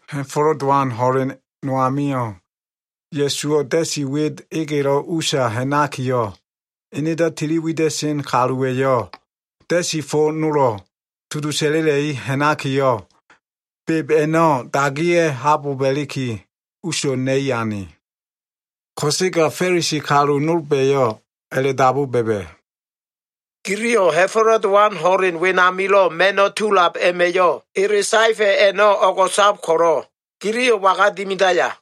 Ha꞉fo꞉lo꞉ Dowan ho꞉len no amio꞉, Ya꞉suwo꞉ da꞉si wit egelo꞉ usa ha꞉nakiyo꞉, enedo꞉ tili wida꞉sen kaluwa꞉yo꞉ da꞉si fo nolo꞉ tudu sa꞉la꞉la꞉i ha꞉nakiyo꞉, beb a꞉no꞉ dagiya꞉ haboba꞉liki, uso꞉ na꞉i ane. Ko꞉sega Fa꞉lisi kalu nolba꞉yo꞉ a꞉la꞉dabu ba꞉ba꞉, “Giliyo꞉ Ha꞉fo꞉lo꞉ Dowan ho꞉len wenamilo꞉ ma꞉no꞉ tulab a꞉ma꞉yo꞉ ele saefa꞉ a꞉no꞉ o꞉go꞉sab ko꞉lo꞉, giliyo꞉ waga dimidaya?”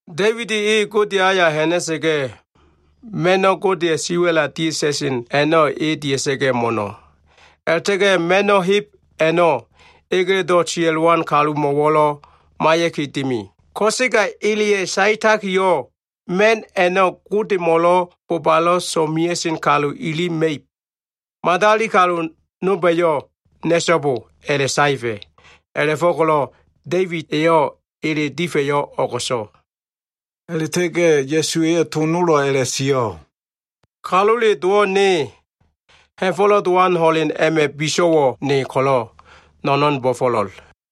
Da꞉ibid e Godeya꞉ aya ha꞉na꞉sa꞉ga꞉, ma꞉no꞉ Godeya꞉ siwa꞉la dia꞉ta꞉sen a꞉no꞉, e dia꞉sa꞉ga꞉ mo꞉no꞉. A꞉la꞉ta꞉ga꞉ ma꞉no꞉ heb a꞉no꞉ egeledo꞉ sia꞉lowan kalumo꞉wo꞉lo꞉ maiya꞉ki dimi. Ko꞉sega eleya꞉ saetakiyo꞉, ma꞉n a꞉no꞉ Godemo꞉lo꞉ bobalo꞉ so꞉mea꞉sen kalu ili ma꞉ib. Madali kalu nolba꞉yo꞉ na꞉so꞉bo a꞉la꞉saefa꞉. A꞉la꞉fo꞉ko꞉lo꞉ Da꞉ibid eyo꞉ ele difa꞉yo꞉ o꞉go꞉so꞉.” A꞉la꞉ta꞉ga꞉ Ya꞉su eyo꞉ to nolo꞉ a꞉la꞉sio꞉, “Kalule Dowo꞉ ne, Ha꞉fo꞉lo꞉ Dowan ho꞉len a꞉ma꞉ biso꞉wo꞉ ne ko꞉lo꞉, no꞉no꞉n bo꞉fo꞉lo꞉l.”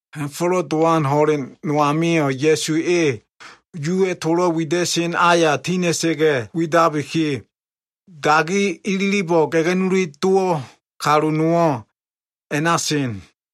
Ha꞉fo꞉lo꞉ Dowan ho꞉len no amio꞉ Ya꞉su e Yuwa꞉ tolo꞉ wida꞉sen aya tina꞉sa꞉ga꞉ widabiki, dagi ililibo꞉ ga꞉ga꞉nuli dowo꞉ kalu nowo꞉ a꞉na sen.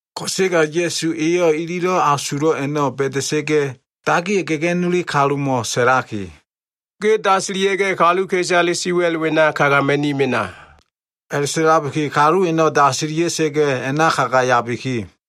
Ko꞉sega Ya꞉su eyo꞉ ililo꞉ asulo꞉ a꞉no꞉ ba꞉da꞉sa꞉ga꞉, dagiyo꞉ ga꞉ga꞉nuli kalumo꞉ sa꞉laki, “Ge dasilia꞉ga꞉ kaluka꞉isale siwa꞉l wena kagama꞉ni mena.” A꞉la꞉sa꞉labiki, kalu a꞉no꞉ dasilia꞉sa꞉ga꞉ a꞉na kagayabiki,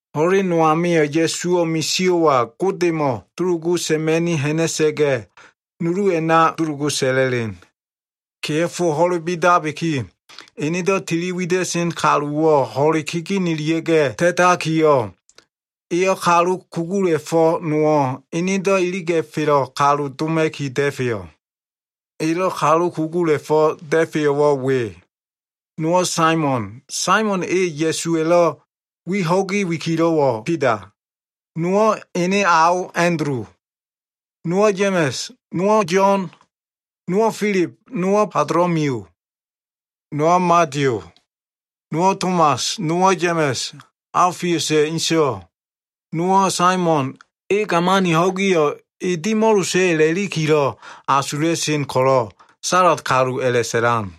Ho꞉len no amio꞉ Ya꞉suwo꞉ misio꞉wa Godemo꞉ dulugu sa꞉ma꞉ni ha꞉na꞉sa꞉ga꞉, nulu a꞉na dulugu sa꞉la꞉len. Kea꞉fo ho꞉le bidabiki, enedo꞉ tiliwida꞉sen kaluwo꞉ ho꞉le kegenelia꞉ga꞉ ta꞉takiyo꞉, eyo꞉ kalu kugula꞉fo꞉ nowo꞉ enedo꞉ iliga꞉felo꞉ kalu doma꞉ki da꞉feyo꞉. Elo꞉ kalu kugula꞉fo꞉ da꞉feyo꞉wo꞉ we. Nowo꞉ Saimon, Saimon e Ya꞉suwa꞉lo꞉ wi ho꞉gi wikilo꞉wo꞉ Bida. Nowo꞉ ene ao Andulu, nowo꞉ Ya꞉ma꞉s, nowo꞉ Yo꞉n, nowo꞉ Filib, nowo꞉ Batolomiyu. Nowo꞉ Madiyu, nowo꞉ Tomas, nowo꞉ Ya꞉ma꞉s, Aofiusa꞉ inso꞉, nowo꞉ Saimon, e gamani ho꞉giyo꞉ e dimo꞉losa꞉ a꞉lakilo꞉ asula꞉sen ko꞉lo꞉ Sa꞉la꞉t kalu a꞉la꞉sa꞉lan.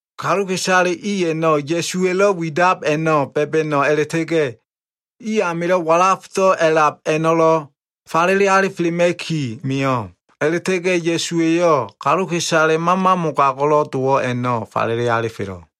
Kaluka꞉isale i a꞉no꞉ Ya꞉suwa꞉lo꞉ widab a꞉no꞉ da꞉ba꞉no꞉ a꞉la꞉ta꞉ga꞉, i amilo꞉ walafdo꞉ a꞉lab a꞉no꞉lo꞉ falele alifelema꞉ki mio꞉. A꞉la꞉ta꞉ga꞉ Ya꞉suwa꞉yo꞉ kaluka꞉isale mama mogago꞉lo꞉ dowo꞉ a꞉no꞉ falele alifelo꞉.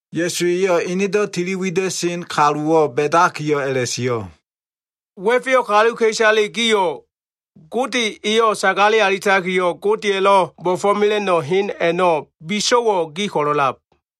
Ya꞉su eyo꞉ enedo꞉ tiliwida꞉sen kaluwo꞉ ba꞉dakiyo꞉ a꞉la꞉sio꞉. “Wa꞉feyo꞉ kaluka꞉isale gio꞉, Gode eyo꞉ sagale alitakiyo꞉, Godeya꞉lo꞉ bo꞉fo꞉mela꞉no꞉ hen a꞉no꞉ biso꞉wo꞉ gi ko꞉lo꞉ a꞉lab.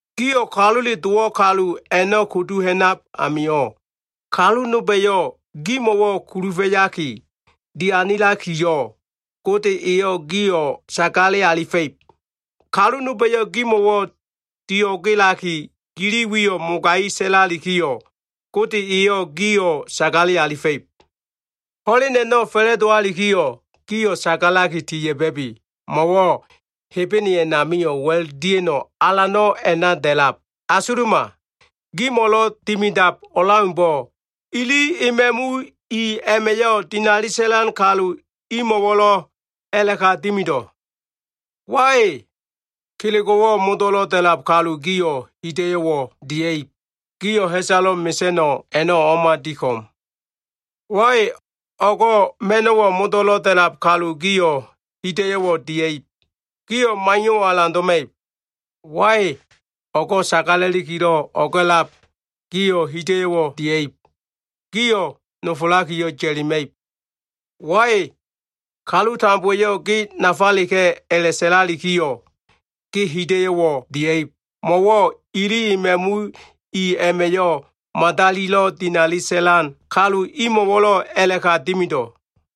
Gio꞉ Kalule Dowo꞉ kalu a꞉no꞉ kudu ha꞉nab amio꞉, kalu nolba꞉yo꞉ gimo꞉wo꞉ kulufa꞉yaki dianilalikiyo꞉, Gode eyo꞉ gio꞉ sagale alifa꞉ib. Kalu nolba꞉yo꞉ gimo꞉wo꞉ dio꞉gelaki, gili wiyo꞉ mogai sa꞉lalikiyo꞉, Gode eyo꞉ gio꞉ sagale alifa꞉ib. “Ho꞉len a꞉no꞉ fa꞉la꞉dowalikiyo꞉, gio꞉ sagalaki tiya꞉ba꞉bi. Mo꞉wo꞉ Hebene a꞉namio꞉ wa꞉l dia꞉no꞉ alano꞉ a꞉na da꞉lab. Asuluma. Gimo꞉lo꞉ dimidab o꞉leaumbo꞉, ili ema꞉mu i a꞉ma꞉yo꞉ dinali sa꞉lan kalu imo꞉wo꞉lo꞉ a꞉la꞉ka dimido꞉. “Wai! Kelego꞉wo꞉ modo꞉lo꞉ da꞉lab kalu gio꞉ hida꞉yo꞉wo꞉ dia꞉ib. Gio꞉ ha꞉salo꞉ mesa꞉no꞉ a꞉no꞉ o꞉ma di ko꞉m. Wai! O꞉go꞉ ma꞉no꞉wo꞉ modo꞉lo꞉ da꞉lab kalu gio꞉ hida꞉yo꞉wo꞉ dia꞉ib. Gio꞉ maiyo꞉wo꞉ alan doma꞉ib. Wai! O꞉go꞉ sagala꞉likilo꞉ o꞉ga꞉lab gio꞉ hida꞉yo꞉wo꞉ dia꞉ib. Gio꞉ nofolakiyo꞉ ya꞉lima꞉ib. Wai! Kalu tambowa꞉yo꞉ ‘ge nafaleka꞉’ a꞉la꞉sa꞉lalikiyo꞉, ge hida꞉yo꞉wo꞉ dia꞉ib. Mo꞉wo꞉ ili ema꞉mu i a꞉ma꞉yo꞉ madalilo꞉ dinali sa꞉lan kalu imo꞉wo꞉lo꞉ a꞉la꞉ka dimido꞉.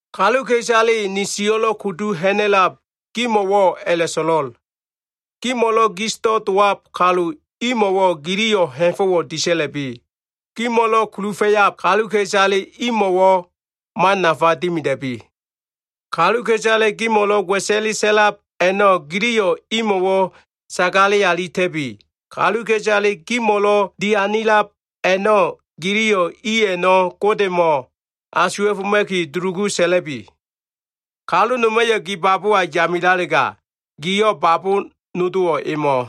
“Kaluka꞉isale ni sio꞉lo꞉ kudu ha꞉na꞉lab gimo꞉wo꞉ a꞉la꞉so꞉lo꞉l. Gimo꞉lo꞉ gisdo꞉ dowab kalu imo꞉wo꞉ giliyo꞉ ha꞉fo꞉wo꞉ disa꞉la꞉bi. Gimo꞉lo꞉ kulufa꞉yab kaluka꞉isale imo꞉wo꞉, man nafa dimida꞉bi. Kaluka꞉isale gimo꞉lo꞉ wa꞉sa꞉le sa꞉lab a꞉no꞉ giliyo꞉ imo꞉wo꞉ sagale alita꞉bi. Kaluka꞉isale gimo꞉lo꞉ dianilab a꞉no꞉, giliyo꞉ i a꞉no꞉ Godemo꞉ asuwa꞉foma꞉ki dulugu sa꞉la꞉bi. Kalu noma꞉yo꞉ gi babowa yamilalega, giyo꞉ babo nodowo꞉ emo꞉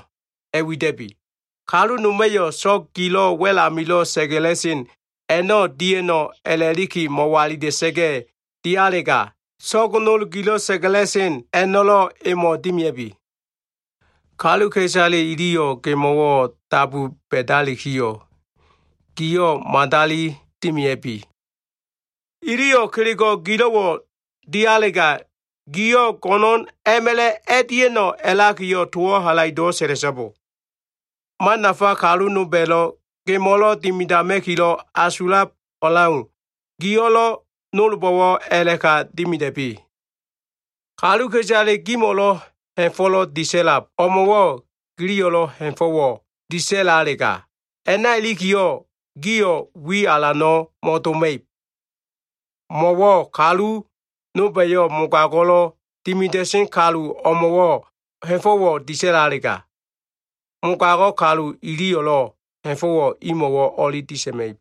a꞉wida꞉bi. Kalu noma꞉yo꞉ so꞉g gilo꞉ wa꞉l amilo꞉ sa꞉ga꞉la꞉sen a꞉no꞉ dia꞉no꞉ a꞉laki mo꞉walila꞉sa꞉ga꞉ dialega, so꞉g nol gilo꞉ sa꞉ga꞉la꞉sen a꞉no꞉lo꞉ emo꞉ dimia꞉bi. Kaluka꞉isale iliyo꞉ gemo꞉wo꞉ dabu ba꞉dalikiyo꞉, giyo꞉ madali dimia꞉bi. Iliyo꞉ kelego꞉ gilo꞉wo꞉ dialega, giyo꞉ go꞉no꞉na꞉ma꞉la꞉ a꞉dia꞉no꞉ a꞉lakiyo꞉ towo꞉ halaido꞉wo꞉ sa꞉la꞉so꞉bo. Man nafa kalu nolba꞉lo꞉ gemo꞉lo꞉ dimidama꞉kilo꞉ asulab o꞉leau, giyo꞉lo꞉ nolbo꞉wo꞉ a꞉la꞉ka dimida꞉bi. “Kaluka꞉isale gimo꞉lo꞉ ha꞉fo꞉lo꞉ disa꞉lab o꞉mo꞉wo꞉ giliyo꞉lo꞉ ha꞉fo꞉wo꞉ disa꞉lalega, a꞉na ilikiyo꞉ gio꞉ wi alano꞉ mo꞉doma꞉ib. Mo꞉wo꞉ kalu nolba꞉yo꞉ mogago꞉lo꞉ dimida꞉sen kalu o꞉mo꞉wo꞉ ha꞉fo꞉wo꞉ disa꞉lalega, mogago꞉ kalu iliyo꞉lo꞉ ha꞉fo꞉wo꞉ imo꞉wo꞉ o꞉li disa꞉ma꞉ib.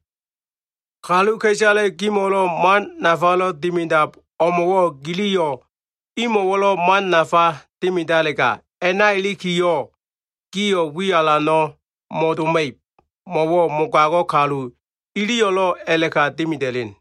Kaluka꞉isale gimo꞉lo꞉ man nafalo꞉ dimidab o꞉mo꞉wo꞉ giliyo꞉ imo꞉wo꞉lo꞉ man nafa dimidalega, a꞉na ilikiyo꞉ gio꞉ wi alano꞉ mo꞉doma꞉ib. Mo꞉wo꞉ mogago꞉ kalu iliyo꞉lo꞉ a꞉la꞉ka dimida꞉len.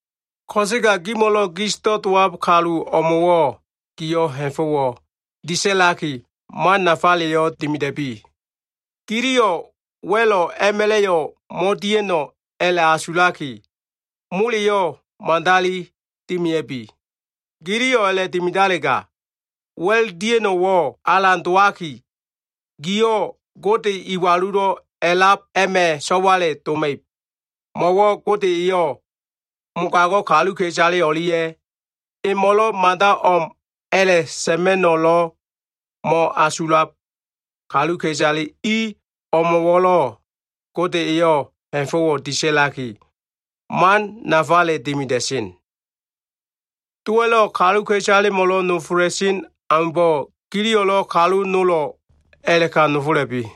Ko꞉sega gimo꞉lo꞉ gisdo꞉ dowab kalu o꞉mo꞉wo꞉ gio꞉ ha꞉fo꞉wo꞉ disa꞉laki, man nafaleyo꞉ dimida꞉bi. Giliyo꞉ wa꞉lo꞉ a꞉ma꞉la꞉yo꞉ mo꞉dia꞉no꞉ a꞉la꞉asulaki, moleyo꞉ madali dimia꞉bi. Giliyo꞉ a꞉la꞉dimidalega, wa꞉l dia꞉no꞉wo꞉ alan dowaki, gio꞉ Gode Iwalulo꞉ A꞉lab a꞉ma꞉ so꞉wale doma꞉ib. Mo꞉wo꞉ Gode eyo꞉ mogago꞉ kaluka꞉isale o꞉lia꞉ emo꞉lo꞉ mada o꞉m a꞉la꞉sa꞉ma꞉no꞉lo꞉ mo꞉asulab kaluka꞉isale i o꞉mo꞉wo꞉lo꞉, Gode eyo꞉ ha꞉fo꞉wo꞉ disa꞉laki, man nafale dimida꞉sen. Dowa꞉lo꞉ kaluka꞉isalemo꞉lo꞉ nofola꞉sen aumbo꞉, giliyo꞉lo꞉ kalu nolo꞉ a꞉la꞉ka nofola꞉bi.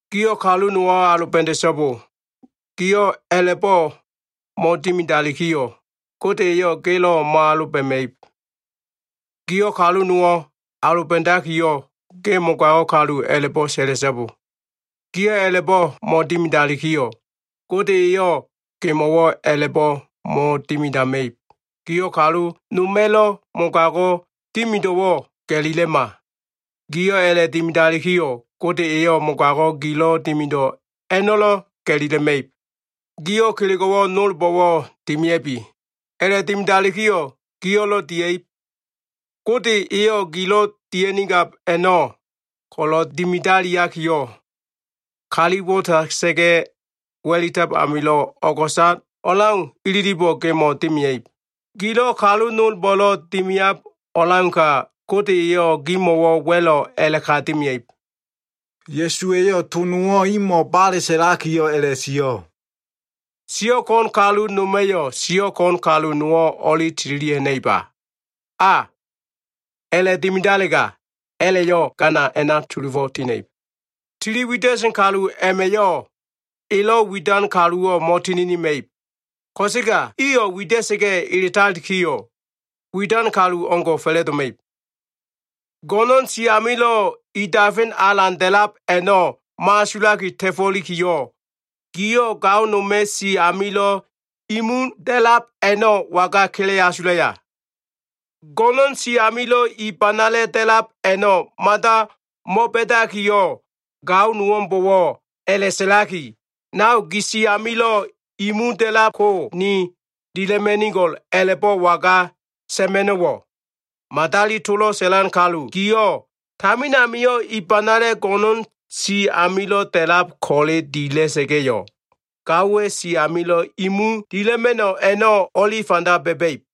“Giyo꞉ kalu nowo꞉ aloba꞉da꞉so꞉bo. Giyo꞉ a꞉la꞉bo꞉ mo꞉dimidalikiyo꞉, Gode eyo꞉ gelo꞉ mo꞉aloba꞉ma꞉ib. Giyo꞉ kalu nowo꞉ aloba꞉dakiyo꞉, ‘Ge mogago꞉ kalu’ a꞉la꞉bo꞉ sa꞉la꞉so꞉bo. Giyo꞉ a꞉la꞉bo꞉ mo꞉dimidalikiyo꞉, Gode eyo꞉ gemo꞉wo꞉ a꞉la꞉bo꞉ mo꞉dimidama꞉ib. Giyo꞉ kalu noma꞉lo꞉ mogago꞉ dimido꞉wo꞉ ga꞉lilema. Giyo꞉ a꞉la꞉dimidalikiyo꞉, Gode eyo꞉ mogago꞉ gilo꞉ dimido꞉ a꞉no꞉lo꞉ ga꞉lila꞉ma꞉ib. Gilo꞉ kelego꞉wo꞉ nolbo꞉wo꞉ dimia꞉bi. A꞉la꞉dimidalikiyo꞉, giyo꞉lo꞉ dia꞉ib. Gode eyo꞉ gilo꞉ dia꞉nigab a꞉no꞉ ko꞉lo꞉ dimidaliakiyo꞉, kali disa꞉la꞉sa꞉ga꞉ wa꞉litab amilo꞉ o꞉go꞉sab o꞉leau ililibo꞉ gemo꞉ dimia꞉ib. Giyo꞉ kalu nolbo꞉lo꞉ dimiab o꞉leauka, Gode eyo꞉ gimo꞉wo꞉ wa꞉lo꞉ a꞉la꞉ka dimia꞉ib.” Ya꞉suwa꞉yo꞉ to nowo꞉ imo꞉ bale sa꞉lakiyo꞉ a꞉la꞉sio꞉, “Siyo꞉ ko꞉n kalu noma꞉yo꞉ siyo꞉ ko꞉n kalu nowo꞉ o꞉li tililia꞉ ha꞉na꞉iba? A, a꞉la꞉dimidalega, a꞉la꞉yo꞉ gana a꞉na sulufo꞉ tina꞉ib. Tili wida꞉sen kalu a꞉ma꞉yo꞉ elo꞉ widan kaluwo꞉ mo꞉tininima꞉ib. Ko꞉sega iyo꞉ wida꞉sa꞉ga꞉ eletalikiyo꞉, widan kalu o꞉ngo꞉ fa꞉la꞉doma꞉ib. Go꞉no꞉n si amilo꞉ i dafen alan da꞉lab a꞉no꞉ mo꞉asulaki ta꞉fo꞉likiyo꞉, giyo꞉ gao noma꞉ si amilo꞉ i mu da꞉lab a꞉no꞉ waga kele asulaya? Go꞉no꞉n si amilo꞉ i banala꞉ da꞉lab a꞉no꞉ mada mo꞉ba꞉dakiyo꞉, gao nowo꞉mbo꞉wo꞉ a꞉la꞉sa꞉laki, ‘Nao, gi si amilo꞉ i mu da꞉lab ko ni dila꞉ma꞉nigo꞉l’ a꞉la꞉bo꞉ waga sa꞉ma꞉no꞉wo꞉? Madali tolo꞉ sa꞉lan kalu giyo꞉, tamin amio꞉ i banala꞉ go꞉no꞉n si amilo꞉ da꞉lab ko꞉le dila꞉sa꞉ga꞉yo꞉, gaowa꞉ si amilo꞉ i mu dila꞉ma꞉no꞉ a꞉no꞉ o꞉li fanda ba꞉ba꞉ib.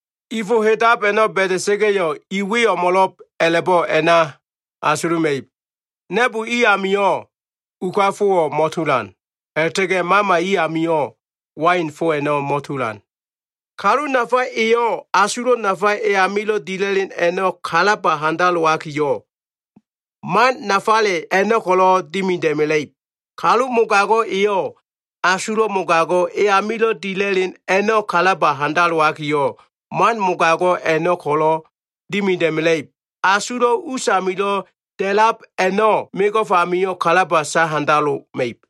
I fo hedab a꞉no꞉ ba꞉da꞉sa꞉ga꞉yo꞉, i we o꞉mo꞉lo꞉b a꞉la꞉bo꞉ a꞉na asuluma꞉ib. Na꞉bo i amio꞉ uka fowo꞉ mo꞉tulan. A꞉la꞉ta꞉ga꞉ bilisa꞉ me amio꞉ wain fo a꞉no꞉ mo꞉tulan. Kalu nafa eyo꞉, asulo꞉ nafa e amilo꞉ dila꞉len a꞉no꞉ kalaba handalowakiyo꞉, man nafale a꞉no꞉ ko꞉lo꞉ dimida꞉mela꞉ib. Kalu mogago꞉ eyo꞉, asulo꞉ mogago꞉ e amilo꞉ dila꞉len a꞉no꞉ kalaba handalowakiyo꞉, man mogago꞉ a꞉no꞉ ko꞉lo꞉ dimida꞉mela꞉ib. Asulo꞉ usamilo꞉ da꞉lab a꞉no꞉, mego꞉f amio꞉ kalaba sahandaloma꞉ib.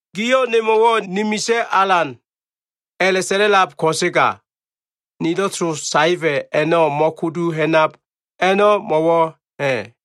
“Giyo꞉ nemo꞉wo꞉ ‘Ni Misa꞉ Alan’ a꞉la꞉sa꞉la꞉lab ko꞉sega, nilo꞉ to saefa꞉ a꞉no꞉ mo꞉kudu ha꞉nab a꞉no꞉, mo꞉wo꞉ ha꞉?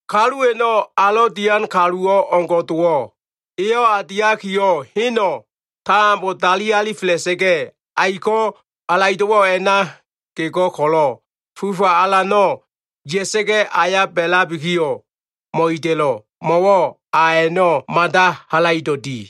Kalu a꞉no꞉ alo꞉ dian kaluwo꞉ o꞉ngo꞉ dowo꞉. Eyo꞉ a diakiyo꞉, heno꞉ tambo dali alifela꞉sa꞉ga꞉, aiko꞉ halaido꞉wo꞉ a꞉na gego꞉ ko꞉lo꞉ fufa alano꞉ ya꞉sa꞉ga꞉, aya ba꞉labikiyo꞉ mo꞉ida꞉lo꞉. Mo꞉wo꞉ a a꞉no꞉ mada halaido꞉ di.